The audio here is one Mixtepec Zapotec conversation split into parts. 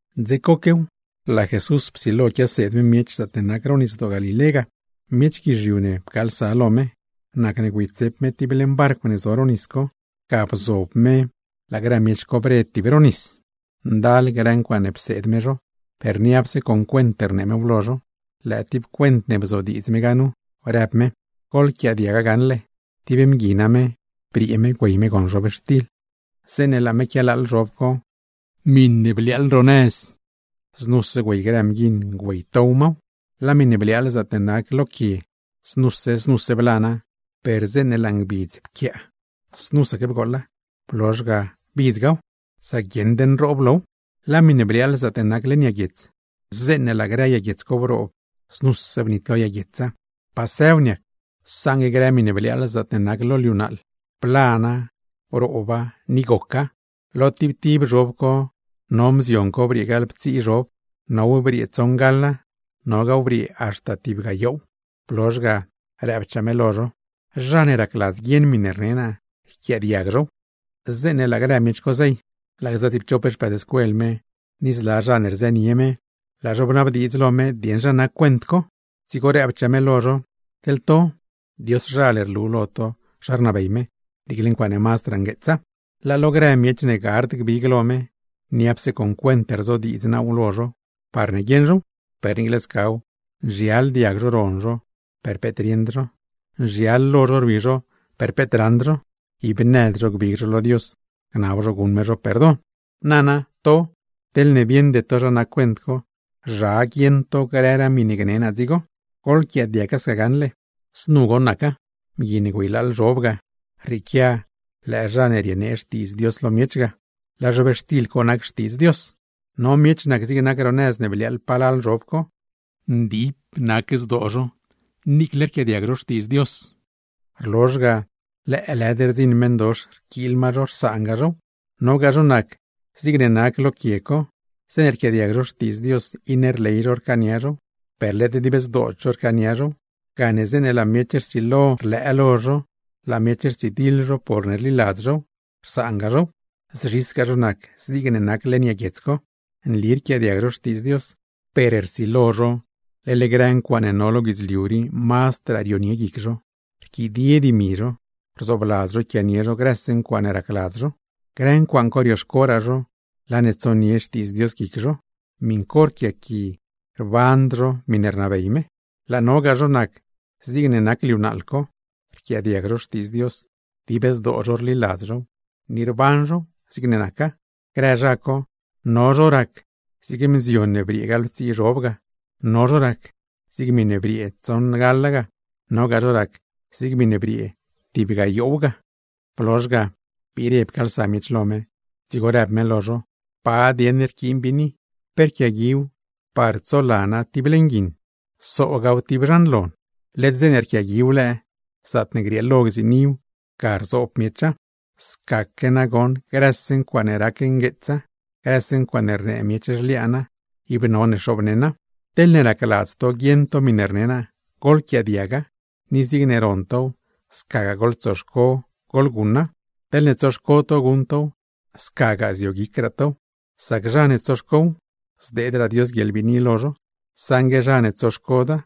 Dze coquew, laa Jesús psilo quiaseed miech zaatne nac ro Nisdoo Galilé ga. Miech guizhiu ne pcaalsa lo me, nacne güeytsep me tib leṉ barcw ne zo ro nis co, ga bzob me laa grë miech co bre tib ro nis. Ndal grë ncuaaṉe pseed me zho, per niapse con cuent rnee mew lo zho. Lëë tib cuent ne bzodiidz me ga nu, rëb me: ―¡Goḻquiaadiaga gaṉle! Tib mgui name, briee me güey me gon zhobxtil. Zeeṉe laa me quialaaḻ zhob co, miṉe bliaaḻ gax ro nëz; znuse güey grë mguiṉ güeytow maw. Laa miṉe bliaaḻ zaatne nac lo quie, znuse znuse blana; per zeeṉe laa lo ngbidz briee, znusaque bgooḻa blozh ga bidzgaw; sac guieṉd nroob low. Laa miṉe bliaaḻ zaatne nac leṉ yag guiets, zeeṉe laa grë yag guiets co broob znuse bnitlo yag guietsa, pasëw niac. Saṉgue grë miṉe bliaaḻ zaatne nac lo liu naaḻ, blana, brooba ni goca; lo tib tib zhob co no mzion co briee gaḻptsii zhob, now briee tsoṉgaḻa, nogaaw briee haxta tib gayoow. Blozh ga, rëbchaa me lo zho: ―Zha ne racladz guieṉ miṉe rne naa, yquiaadiag zhow. Zeeṉe laa grë miech co zey, laa gza tsiipchop xpëëdscuel me, ni zla zha ne rzënie me, laa zho bnabdiidz lo me dieṉ zha nac cuent co. Dzigo rëbchaa me lo zho: ―Teḻ to, Dioszhal rlu lo to zha rnabey me, niicle ncuaaṉe mazdraa ngueetsa; laa lo grëraa miech ne gard gbig lo me niapse con cuent rzodiidz naaw lo zho parne guieṉ zhow. Per niicle scaw, nzhial diag zho ron zho, per peet rieṉd zho; nzhial lo zho rwi zho, per peet raṉd zho; ib nëd zho gbig zho lo Dios, gnab zho guṉ me zho perdon. ’Nana to, teḻne bieṉde to zha nac cuent co, ¿zha guieṉ to grëraa miṉe gne naa dzigo? Goḻquiaadiaga gaṉle, znu goṉ naca: Mgui ne güeylaaḻ zhob ga, rrieequia lëë zha ne rienee Xtiidz Dios lo miech ga, laa zhobxtil co nac Xtiidz Dios. No miech nac zig nac ro nëz ne bliaaḻ palal zhob co: rquiaadiag zho Xtiidz Dios, rlozh ga lëëlëd rdziṉ meṉdox rquiil ma zho, rsaanga zhow. Nogaa zho nac zigne nac lo quie co: zeeṉe rquiaadiag zho Xtiidz Dios, iṉe rley zho rcaania zhow, per led dib zdood zho rcaania zhow; gane zeeṉe laa miech rsilo rlëë lo zho, laa miech rtsidiḻ zho porne rliladz zhow, rsaanga zhow. Zzhisgaa zho nac zigne nac leṉ yag guiets co: nli rquiaadiag zho Xtiidz Dios, per rsilo zho leḻ grë ncuaaṉe no lo guidzliu rii mazdraa rionie guic zho, rquidie grë dimi zho, rzoobladz zho yquianie zho grëse ncuaaṉe racladz zho. Grë ncuaaṉ co rioxcoraa zho, laa ne tsonie Xtiidz Dios guic zho, miṉ co rquiaqui ib ruṉd zho miṉe rnabey me. Laa nogaa zho nac zigne nac liu naaḻ co: rquiaadiag zho Xtiidz Dios, dib zdoo zho rliladz zhow, ni rban zhow zigne naca. Grë zha co, no zho nac zig mzion ne briee gaḻptsii zhob ga, no zho nac zig miṉe briee tsoṉgaḻa, nogaa zho nac zig miṉe briee tib gayoow ga. Blozh ga, biire pcaalsa miech lo me, dzigo rëb me lo zho: ―¿Pa dieṉ rquiin biini? ¿Pe rquiaguiw par tsolana tib leṉ guiṉ o soogaaw tib zhan lon? Led zeeṉe rquiaguiw lëë, zaatne grieelo gziiniw ga rzoob zhow. Scaque nagoṉ grëse ncuaaṉe rac ngueetsa, grëse ncuaaṉe rnee miech zhliaana, ib none xoobneṉa. ’Teḻne racladz to guieṉ to miṉe rne naa, goḻquiaadiaga; ni zigne ron tow scagaa goḻtsoxco goḻguṉa. Teḻne tsoxco to guṉ tow, scagaa zioguicraa tow. Sac zha ne tsoxcow, zdeedraa Dios guieḻbiini lo zho; saṉgue zha ne tsoxcoda,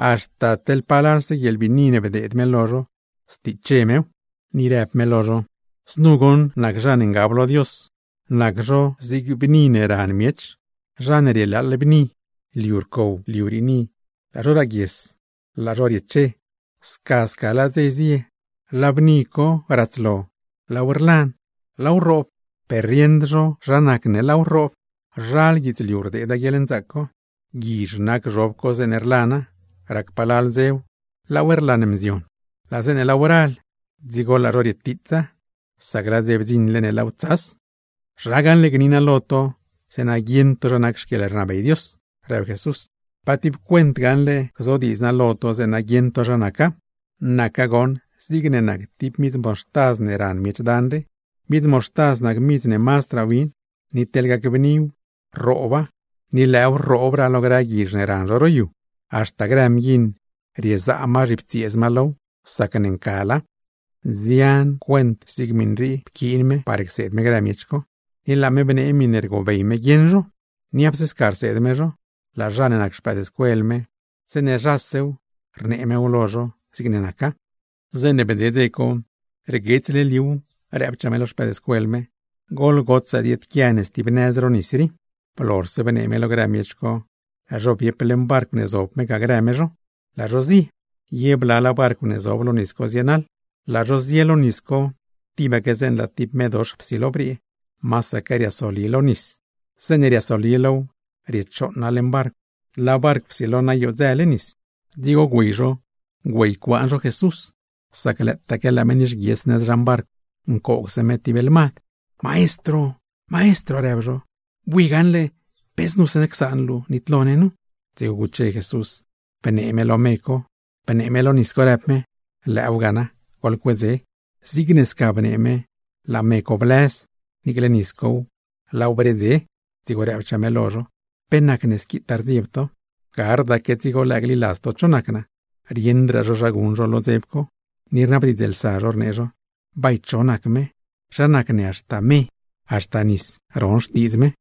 haxta teḻ palalse guieḻbiini ne bdeed me lo zho stiche mew. Ni rëb me lo zho: ―Znu goṉ nac zha ne ngab lo Dios; nac zho zig bni ne ran miech. Zha ne rielaaḻ bni co, liu rcow, liu riini, laa zho raaguies, laa zho rieche. Sca sca laa dze zie, laa bni co ratslo, laaw rlan, laaw rroob, per rieṉd zho zha nacne laaw rroob. ’Zhal guidzliu rdeeda guieḻnzaac co, guizh nac zhob co zeeṉe rlana, rac palal dzew laaw rlan mzion. Laa zeeṉe laaw ral, dzigo laa zho rietiitsa, sac laa dze bdziṉle ne laaw tsas. ’¿Zha gaṉle gni naa lo to zeeṉa guieṉ to zha nac xquieḻrnabey Dios? ―rëb Jesús―. ¿Pa tib cuent gaṉle gzodiidz naa lo to zeeṉa guieṉ to zha naca? Naca goṉ zigne nac tib midz moxtaz ne ran miech dan rii. Midz moxtaz nac midz ne mazdraa win, ni teḻ gacbniw, rrooba, ni lëëw rroobraa lo grë guizh ne ran zho ro yu, haxta grë mguiṉ riezaa zhiptsieez ma low sacne ncala. Nzian grë cuent rii pquiin me par cseed me grë miech co, ni laa me bnee miṉe rgobey me guieṉ zho. Niapse sca rseed me zho, laa zha ne nac xpëëdscuel me, zeeṉe zhasew rnee mew lo zho zigne naca. Zeeṉe bdze dze co, rguetsle liuw rëbchaa me lo xpëëdscuel me: ―Goḻgotsaa dieedquia ne stib nëz lo nis rii. Blozhse bnee me lo grë miech co, laa zho biep leṉ barcw ne zob me ga grë me zho, laa zho zie. Ye blalaa barcw ne zob lo nis co zienaḻ. Laa zho zie, tibaque zeeṉe laa tib medox psilo briee, masaque rlis me lo nis co; zeeṉe riasoli low riechooṉa leṉ barcw, laa barcw psilo noyodzële nis. Dzigo güey zho güeycuaan zho Jesús, sac lëëtaque laa me nixguies nëz zhan barcw ncoogse me tib lmad. ―¡Maestro! ―rëb zho―. Bui gaṉle, ¿pe znuse csaan luu nitlo ne nu? Dzigo guche Jesús, bnee me lo me co, bnee me lo nis co, rëb me: ―¡Lëëw ga na! ¡Goḻcuedze! Zigne sca bnee me, laa me co blëz, niicle nis cow laaw bredze. Dzigo rëbchaa me lo zho: ―¿Pe nacne squitaa rdzieb to? ¡Gardaque dzigo lëë gliladz to cho nac naa! Rieṉdraa zho zha guṉ zho lo dzeb co, ni rnabdiidzlsa zho rnee zho: ―¿Bay cho nac me, zha nacne haxta me, haxta nisdoo ron xtiidz me?